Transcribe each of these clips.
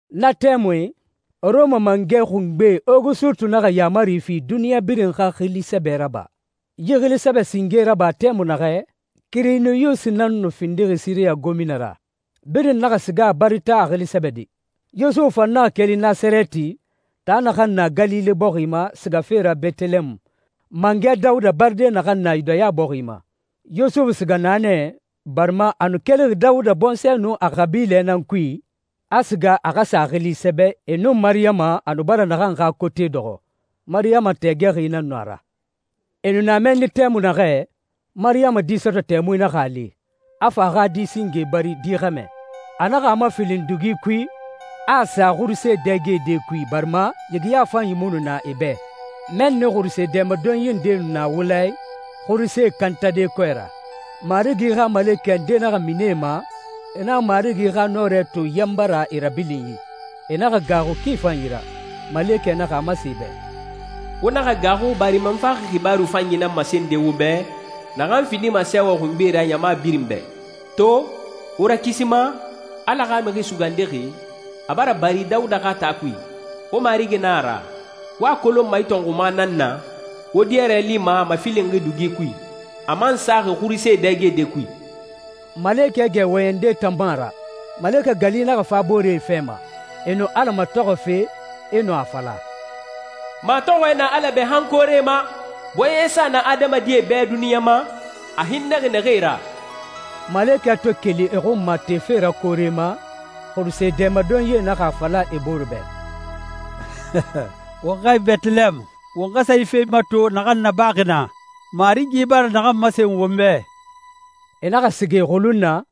Na tɛmui, Rɔma mangɛ xungbe Ogusutu naxa yaamari fi duniɲa birin xa xili sɛbɛ raba. Yi xili sɛbɛ singe raba tɛmui naxɛ, Kirinyusi nan nu findixi Siriya gomina ra. Birin naxa siga a bari taa a xili sɛbɛde. Yusufu fan naxa keli Nasarɛti, taa naxan na Galile bɔxi ma, sigafe ra Bɛtɛlɛɛmu, mangɛ Dawuda baride naxan na Yudaya bɔxi ma. Yusufu siga naa nɛ, barima a nu kelixi Dawuda bɔnsɔɛ nun a xabilɛ nan kui, a siga a xa sa a xili sɛbɛ, e nun Mariyama, a nu bara naxan xa kote dɔxɔ. Mariyama tɛɛgɛxi nan nu a ra. E nu na mɛnni tɛmui naxɛ, Mariyama di sɔtɔ tɛmui naxa a li, a fa a xa di singe bari, di xɛmɛ. A naxa a mafilin dugi kui, a a sa xuruse dɛgede kui, barima yigiya fanyi mu nu na e bɛ. Mɛnni xuruse dɛmadonyi ndee nu na wula i, xurusee kantade kɔɛ ra. Marigi xa malekɛ nde naxa mini e ma, e naxa Marigi xa nɔrɛ to yanba ra e rabilinyi. E naxa gaaxu ki fanyi ra. Malekɛ naxa a masen e bɛ, «Wo naxa gaaxu barima n faxi xibaaru fanyi nan masende wo bɛ, naxan findima sɛɛwɛ xungbe ra ɲama birin bɛ. To, wo Rakisima, Ala xa Mixi Sugandixi, a bara bari Dawuda xa taa kui. Wo Marigi nan a ra. Wo a kolonma yi tɔnxuma nan na, wo diyɔrɛ lima a mafilinxi dugi kui, a man saxi xuruse dɛgede kui.» Malekɛ gɛ wɔyɛnde tan mu a ra, malekɛ gali naxa fa boore fɛ ma. E nu Ala matɔxɔfe, e nu a fala, «Matɔxɔɛ na Ala bɛ han koore ma! Bɔɲɛsa na adamadie bɛ duniɲa ma, a hinnɛxi naxee ra!» Malekɛe to keli e xun ma tefe ra koore ma, xuruse dɛmadonyie naxa a fala e bore bɛ, «Won xɛɛ Bɛtɛlɛɛmu, won xa sa yi fe mato naxan nabaxi naa, Marigi bara naxan masen won bɛ.» E naxa siga e xulun na,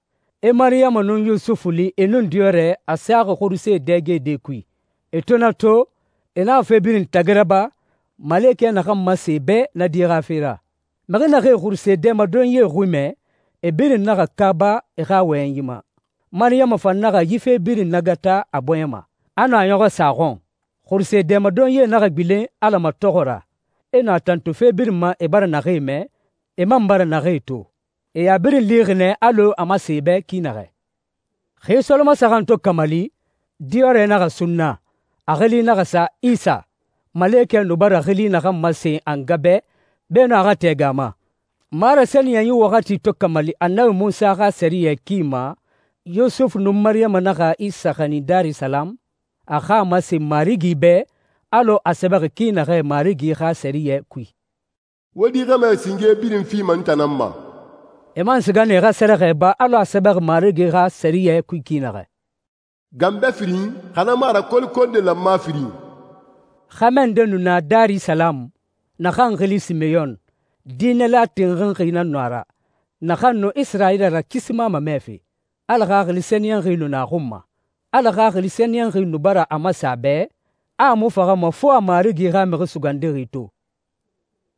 e Mariyama nun Yusufu li, e nun diyɔrɛ, a saxi xuruse dɛgede kui. E to na to, e naxa fe birin tagi raba, malekɛ naxan masen e bɛ na di xa fe ra. Mixi naxee xuruse dɛmadonyie xui mɛ, e birin naxa kaaba e xa wɔyɛnyi ma. Mariyama fan naxa yi fe birin nagata a bɔɲɛ ma, a nu a ɲɔxɔ sa a xɔn. Xuruse dɛmadonyie naxa gbilen Ala matɔxɔ ra, e nu a tantu fe birin ma e bara naxee mɛ, e man bara naxee to. E a birin lixi nɛ alɔ a masen e bɛ ki naxɛ. Xi solomasaxan to kamali, diyɔrɛ naxa sunna. A xili naxa sa Isa, malekɛ nu bara xili naxan masen a nga bɛ beenun a xa tɛɛgɛ a ma. Marasɛniyɛnyi waxati to kamali Annabi Munsa xa sɛriyɛ ki ma, Yusufu nun Mariyama naxa Isa xanin Darisalamu, a xa masen Marigi bɛ, alɔ a sɛbɛxi ki naxɛ Marigi xa sɛriyɛ kui, «Wo di xɛmɛ singe birin fima n tan nan ma.» E man siga nɛ e xa sa sɛrɛxɛ ba alɔ a sɛbɛxi Marigi xa sɛriyɛ kui ki naxɛ, «ganbɛ firin, xa na mu a ra kolokonde lanma firin.» Xɛmɛ nde nu na Darisalamu, naxan xili Simeyɔn. Diinɛla tinxinxi nan nu a ra, naxan nu Isirayila Rakisima mamɛfe. Ala Xaxili Sɛniyɛnxi nu na a xun ma. Ala Xaxili Sɛniyɛnxi nu bara a masen a bɛ, a a mu faxama fo a Marigi xa Mixi Sugandixi to.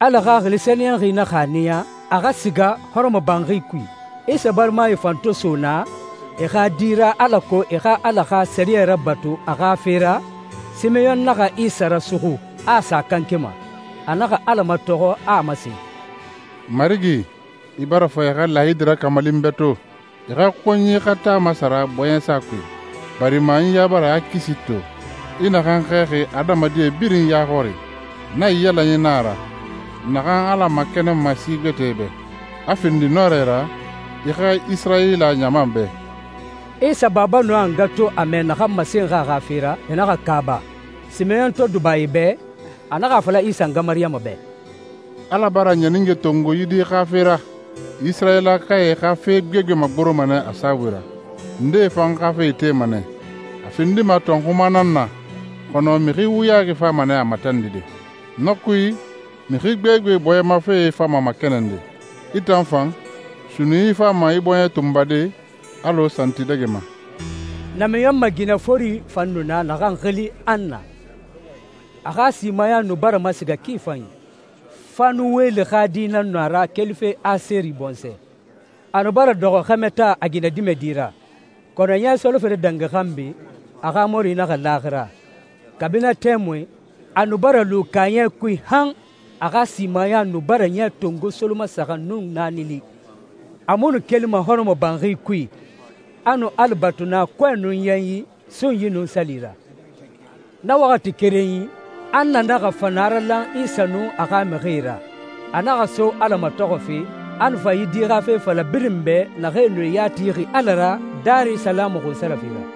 Ala Xaxili Sɛniyɛnxi naxa a niya a xa siga hɔrɔmɔbanxi kui. Isa barimae fan to so naa e xa di ra, alako e xa Ala xa sɛriyɛ rabatu a xa fe ra, Simeyɔn naxa Isa rasuxu, a a sa a kanke ma. A naxa Ala matɔxɔ, a a masen, «Marigi, i bara fa i xa laayidi rakamali n bɛ to, i xa konyi xa taa masara bɔɲɛsa kui, barima n ya bara i xa kisi to, i naxan xɛɛxi adamadie birin ya xɔri. Naiyalanyi nan a ra naxan Ala makɛnɛnma si gbɛtɛe bɛ, a findi nɔrɛ ra i xa Isirayila ɲama bɛ.» Isa baba nun a nga to a mɛ naxan masenxi a xa fe ra, e naxa kaaba. Simeyɔn to duba e bɛ, a naxa a fala Isa nga Mariyama bɛ, «Ala bara ɲanige tongo yi di xa fe ra. Isirayilakae xa fe gbegbe magoroma nɛ a saabui ra, ndee fan xa fe itema nɛ. A findima tɔnxuma nan na, kɔnɔ mixi wuyaxi fama nɛ a matandide. Na kui, mixi gbegbe bɔɲɛ ma fee fama makɛnɛnde. I tan fan, sunnunyi fama i bɔɲɛ tunbade alɔ santidɛgɛma.» Namiɲɔnmɛ ginɛ fori fan nu na, naxan xili Anna. A xa simaya nu bara masiga ki fanyi. Fanuweli xa di nan nu a ra kelife Aseri bɔnsɔɛ. A nu bara dɔxɔ xɛmɛ taa a ginɛdimɛdi ra, kɔnɔ ɲɛ solofere dangi xanbi, a xa mɔri naxa laaxira. Kabi na tɛmui, a nu bara lu kaaɲɛ kui han a xa simaya nu bara ɲɛ tongo solomasaxan nun naani li. A mu nu kelima hɔrɔmɔbanxi kui, a nu Ala batu naa, kɔɛ nun yanyi, sunyi nun sali ra. Na waxati kerenyi, Anna naxa fa naralan Isa nun a xa mixie ra. A naxa so Ala matɔxɔfe, a nu fa yi di xa fe fala birin bɛ, naxee nu e ya tixi Ala ra Darisalamu xunsarafe ra.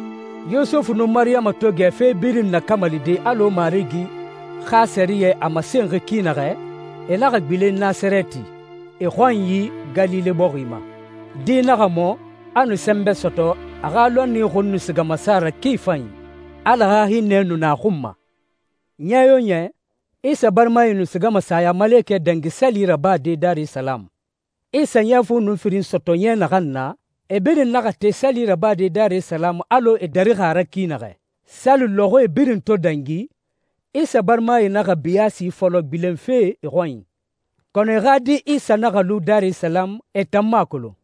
Yusufu nun Mariyama to gɛ fe birin nakamalide alɔ Marigi xa sɛriyɛ a masenxi ki naxɛ, e naxa gbilen Nasarɛti, e xɔnyi Galile bɔxi ma. Di naxa mɔ, a nu sɛnbɛ sɔtɔ, a xa lɔnni xun nu siga masa ra ki fanyi. Ala xa hinnɛ nu na a xun ma. Ɲɛ yo ɲɛ, Isa barimae nu sigama Sayamalekɛ Dangi Sali rabade Darisalamu. Isa ɲɛ fu nun firin sɔtɔ ɲɛ naxan na, e birin naxa te sali rabade Darisalamu alɔ e darixi a ra ki naxɛ. Sali lɔxɔɛe birin to dangi, Isa barimae naxa biyaasi fɔlɔ gbilenfe e xɔnyi, kɔnɔ e xa di Isa naxa lu Darisalamu, e tan mu a kolon.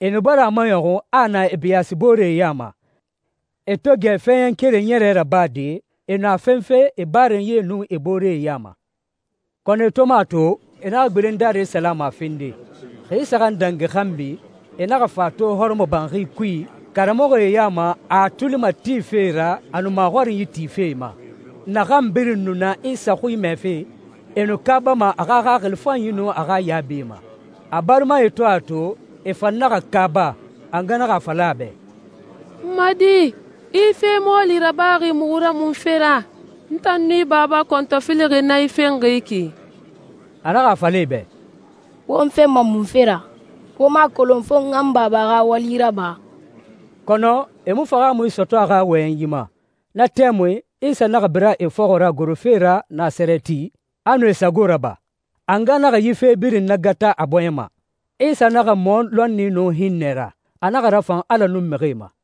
E nu bara a maɲɔxun a a na e biyaasibooree ya ma. E to gɛ fɛɛɲɛn keren ɲɛrɛ rabade, e nu a fenfe e barenyie nun e booree ya ma. Kɔnɔ e to mu a to, e naxa gbilen Darisalamu a fende. Xi saxan dangi xanbi, e naxa fa a to hɔrɔmɔbanxi kui karamɔxɔe ya ma, a a tuli matife e ra, a nu maxɔrinyi tife e ma. Naxan birin nu na Isa xui mɛfe, e nu kaabama a xa xaxili fanyi nun a xa yaabie ma. A barimae to a to, e fan naxa kaaba. A nga naxa a fala a bɛ, «N ma di, i yi fe mɔɔli rabaxi muxu ra munfe ra? N tan nun i baba kɔntɔfilixi nan i fenxi yi ki.» A naxa a fala e bɛ, «Wo n fenma munfe ra? Wo mu a kolon fo n xa n Baba xa wali raba?» Kɔnɔ e mu fahaamui sɔtɔ a xa wɔyɛnyi ma. Na tɛmui, Isa naxa bira e fɔxɔ ra gorofe ra Nasarɛti, a nu e sago raba. A nga naxa yi fe birin nagata a bɔɲɛ ma. Isa naxa mɔ lɔnni nun hinnɛ ra. A naxa rafan Ala nun mixie ma.